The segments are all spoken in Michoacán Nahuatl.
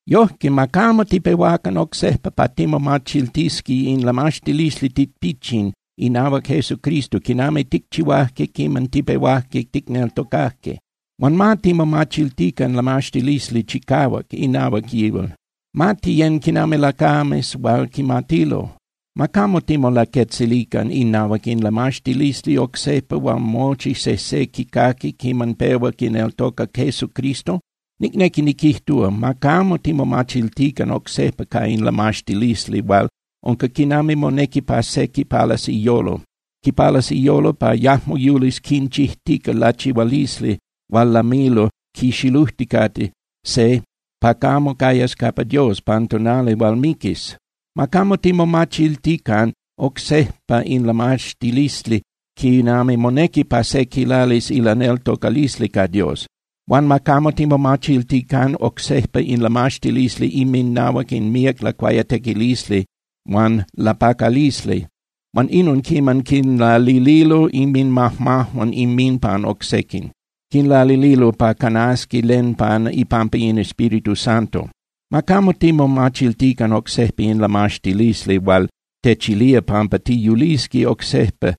Yojque, ma camo tipehuacan oc sejpa pa timomachiltisqui in lamaxtilisli tipichin inahuac Jesucristo quinami ticchihuajque quiman tipehuajque ticneltocajque. Huan ma timomachiltican lamaxtilisli chicahuac inahuac yihual, ma tiyén (tiyecan) quinami lacames hual quimatilo. Ma camo timolaquetzilican inahuac in lamaxtilisli oc sejpa hual mochi sejse quicaqui quiman pehua quineltoca Jesucristo. Nicnequi niquijtúa, ma camo timomachiltican oc sejpa ca in lamaxtilisli hual unca quinami monequi pa se quipalas iyolo. Quipalas iyolo pa yajmo yulis quinchijtica lachihualisli hual lamilo quixilujticate se pa camo cayas capa Dios pan tonali hual miquis. Ma camo timomachiltican oc sejpa in lamaxtilisli quinami monequi pa se quilalis ilaneltocalisli ca Dios. Huan ma camo timomachiltican oc sejpa in lamaxtilisli inminahuac in míac lacuayatequilisli huan lapacalisli, huan inon quiman quinlalililo inminmajmajuan inminpan oc sequin. Quinlalililo pa canasqui len pan ipampa in Espíritu Santo. Ma camo timomachiltican oc sejpa in lamaxtilisli hual techilía pampa tiyulisqui oc sejpa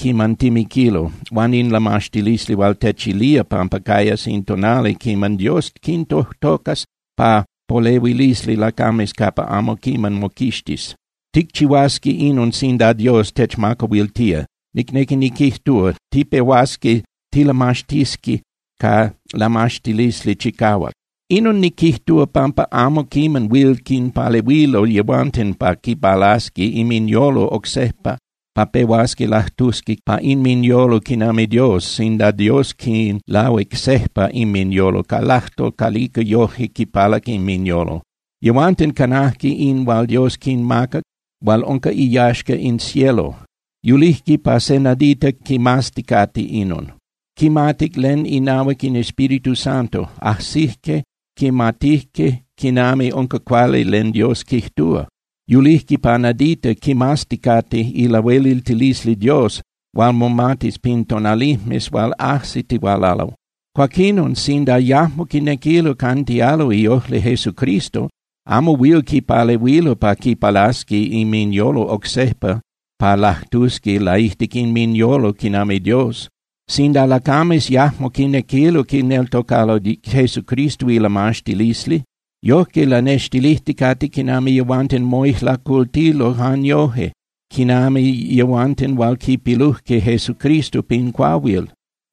quiman timiquilo, huan in lamaxtilisli hual techilía pampa cayas in tonali quiman Dios quintojtocas pa polehuilisli lacames capa amo quiman moquixtis. Ticchihuasqui inon sinda Dios techmacahuiltía, nicnequi niquijtúa, tipehuasqui tilamaxtisqui ca lamaxtilisli chicahuac. Inon niquijtúa, pampa amo quiman huil quinpalehuilo yehuanten pa quipalasqui inminyolo oc sejpa pa pehuasqui lajtusqui pa inminyolo quinami Dios sinda Dios quinlahuic sejpa inminyolo ca ilajtol calica yojque quipalac inminyolo. Yehuanten canajque in hual Dios quinmacac hual unca iyaxca in cielo. Yulijque pa se nadita quimazticate inon. Quimatic len inahuac in Espíritu Santo. Ajsijque quimatijque quinami unca cuali len Dios quijtúa. Yulijque pa nadita quimazticate ilahueliltilisli Dios hual momatis pin tonalijmes hual ajsitihualalo. Cuaquinon, sinda yajmo quinequilo cantialo iojli Jesucristo, amo huil quipalehuilo pa quipalasqui inminyolo oc sejpa pa lajtusqui laijtic inminyolo quinami Dios. Sinda lacames yajmo quinequilo quineltocalo Jesucristo ilamaxtilisli, yojque lanextilijticate quinami yehuanten moijlacultilo jan yoje quinami yehuanten hual quipilujque Jesucristo pin cuahuil.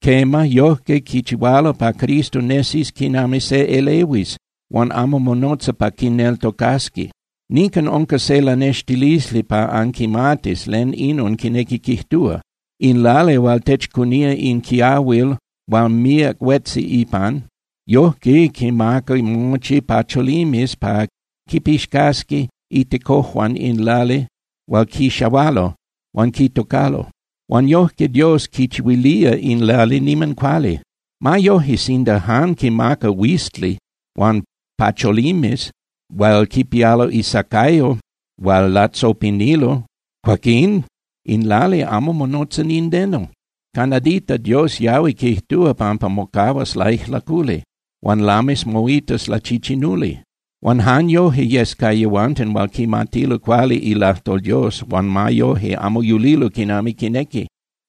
Quema, yojque quichihualo pa Cristo nesis quinami se elehuis hual amo monotza pa quineltocasqui. Nican unca se lanextilisli pa anquimatis len inon quinequi quijtúa: In lali hual techcunía in quiahuil hual míac huetzi ipan, yojque quimaca mochi pacholimes pa quipixcasqui itecojuan in lali hual quixahualo huan quitocalo. Huan yojque Dios quichihuilía in lali niman cuali. Ma yoje, sinda jan quimaca huizli huan pacholimes hual quipialo isacayo hual latzopinilo, cuaquín in lali amo monotza nindeno. Ca nadita Dios yahui quijtúa pampa mocahuas laijlaculi, huan lamis moitas lachichinuli. Huan jan yoje yes ca yehuanten hual quimatilo cuali ilajtol Dios huan ma yoje amo yulilo quinami quinequi.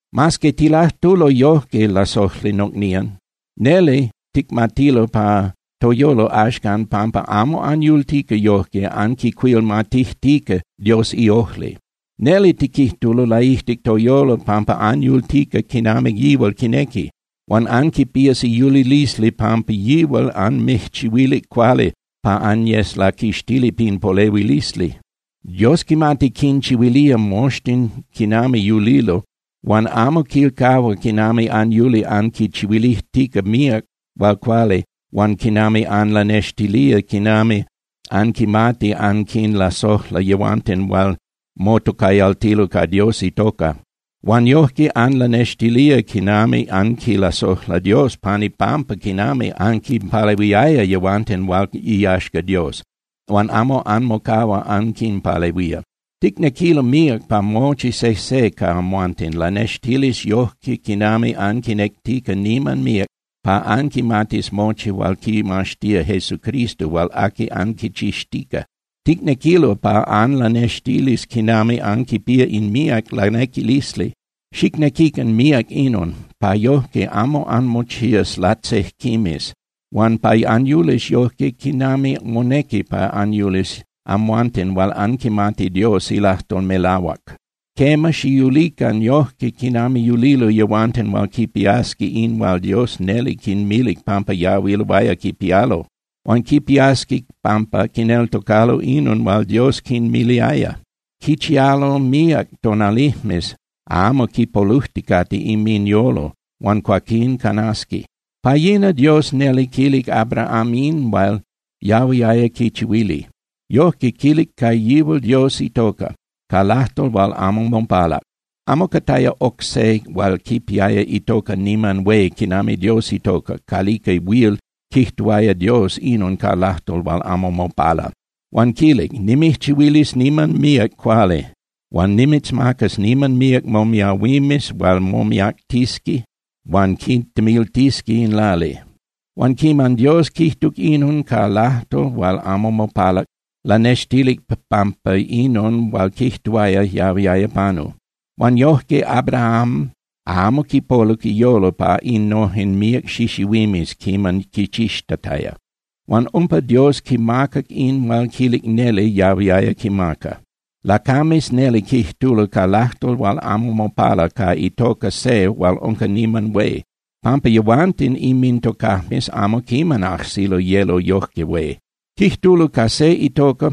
Mas que tilajtulo yojque, lasojli nocnían, neli ticmatilo pa toyolo axcan pampa amo anyultica yojque anquicuilmatijtica Dios iojli. Neli tiquijtulo laijtic toyolo pampa anyultica quinami yihual quinequi. Huan anquipías iyulilisli pampa yihual anmijchihuilic cuali pa anyes laquixtili pin polehuilisli. Dios quimati quinchihuilía moxtin quinami yulilo huan amo quilcahua quinami anyuli anquichihuilijtica míac hual cuali huan quinami anlanextilía quinami anquimati anquinlasojla yehuanten hual motocayaltilo ca Dios itoca. Huan yojque anlanextilía quinami anquilasojla Dios pan ipampa quinami anquinpalehuiaya yehuanten hual iyaxca Dios, huan amo anmocahua anquinpalehuía. Ticnequilo míac pa mochi sejse ca amhuanten lanextilis yojque quinami anquinectica niman míac pa anquimatis mochi hual quimaxtía Jesucristo hual aqui anquichixtica. Ticnequilo pa anlanextilis quinami anquipía in míac lanequilisli. Xicnequican míac inon, pa yojque amo anmochías latzejquimes huan pa anyulis yojque quinami monequi pa anyulis amhuanten hual anquimati Dios ilajtol melahuac. Quema, xiyulican yojque quinami yulilo yehuanten hual quipiasqui in hual Dios neli quinmilic pampa yahuiloaya quipialo. Huan quipiasqui pampa quineltocalo inon hual Dios quinmiliaya. Quichialo míac tonalijmes amo quipolujticate inminyolo, huan cuaquín canasqui. Pa yina Dios neli quilic Abraham in hual yahuiaya quichihuili. Yojque quilic ca yihual Dios itoca, ca lajtol hual amo mopalac. Amo cataya oc se hual quipiaya itoca niman hué quinami Dios itoca calica huil quijtuaya Dios inon ca lajtol hual amo mopala. Huan quilic: “Nimijchihuilis niman míac cuali huan nimitzmacas niman míac momiahuimes hual momiactisqui huan quitemiltisqui in lali.” Huan quiman Dios quijtuc inon ca lajtol hual amo mopalac, lanextilic pampa inon hual quijtuaya yahuiaya panu. Huan yojque Abraham amo quipoluc iyolo pa innojen míac xixihuimes quiman quichixtataya. Huan umpa Dios quimacac in hual quilic neli yahuiaya quimaca. Lacames neli quijtulo ca lajtol hual amo mopala ca itoca se hual unca niman hué, pampa yehuanten inmintocajmes amo quiman ajsilo yelo yojque hué. Quijtulo ca se itoca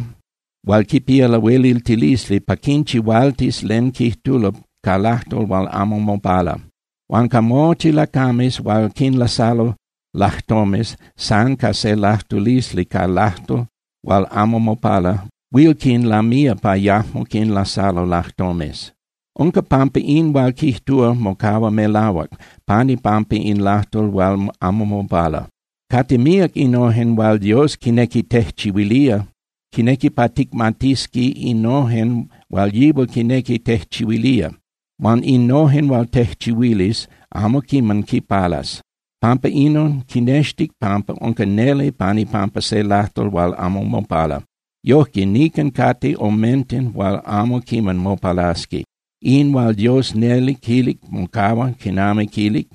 hual quipía lahueliltilisli pa quinchihualtis len quijtulo ca lajtol hual amo mopala. Huan ca mochi lacames hual quinlasalo lajtomes, san ca se lajtulisli ca lajtol hual amo mopala huil quinlamía pa yajmo quinlasalo lajtomes. Unca pampa in hual quijtúa mocahua melahuac pan ipampa in lajtol hual amo mopala. Cate míac innojen hual Dios quinequi tejchihuilía. Quinequi pa ticmatisqui innojen hual yihual quinequi tejchihuilía. Huan innojen hual tejchihuilis, amo quiman quipalas. Pampa inon, quinextic pampa unca neli pan ipampa se lajtol hual amo mopala. Yojque, nican cate omenten hual amo quiman mopalasqui. In hual Dios neli quilic mocahua quinami quilic.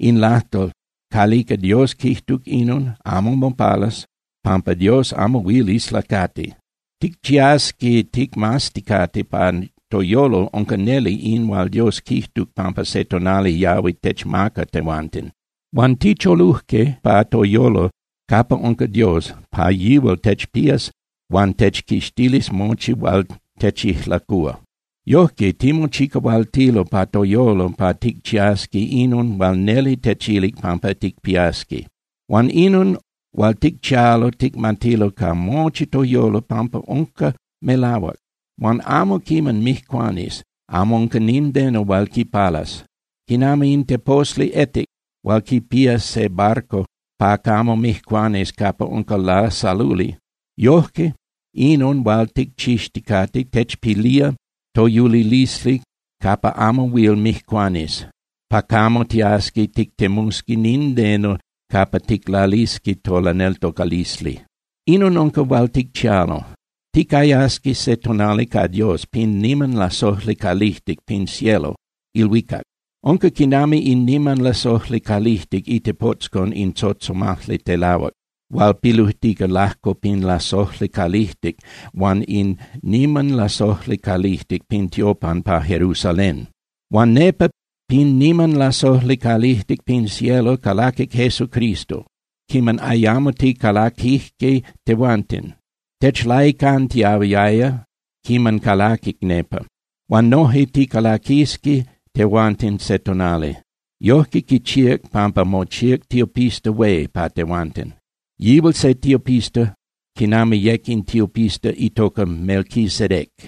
In lajtol calica Dios quijtuc inon amo mopalas pampa Dios amo huil islacati. Ticchiasqui ticmazticate pa toyolo unca neli in hual Dios quijtuc pampa se tonali yahui techmaca tehuanten. Huan ticholujque pa toyolo capa unca Dios pa yihual techpías huan techquixtilis mochi hual techijlacúa. Yojque timochicahualtilo pa toyolo pa ticchiasqui inon hual neli techilic pampa ticpiasqui. Huan inon hual ticchialo ticmatilo ca mochi toyolo pampa unca melahuac. Huan amo quiman mijcuanis, amo unca nindeno hual quipalas. Quinami in teposli etic hual quipía se barco pa camo mijcuanis capa unca lasaluli, yojque inon hual ticchixticate techpilía toyulilisli capa amo huil mijcuanis, pa camo tiasqui tictemusqui nindeno capa ticlalisqui tolaneltocalisli. Inon unca hual ticchialo: Ticayasqui se tonali ca Dios pin niman lasojli calijtic pin cielo (ilhuicac). Unca quinami in niman lasojli calijtic itepotzcon in tzotzomajli telahuac hual pilujtica lajco pin lasojli calijtic huan in niman lasojli calijtic pin tiopan pa Jerusalén. Huan nepa pin niman lasojli calijtic pin cielo calaquic Jesucristo quiman ayamo ticalaquijque tehuanten. Techlaicantiahuiaya quiman calaquic nepa. Huan noje ticalaquisqui tehuanten se tonali. Yojque quichíac pampa mochíac tiopista hué pa tehuanten. Yihual se tiopista quinami yec in tiopista itoca Melquisedec.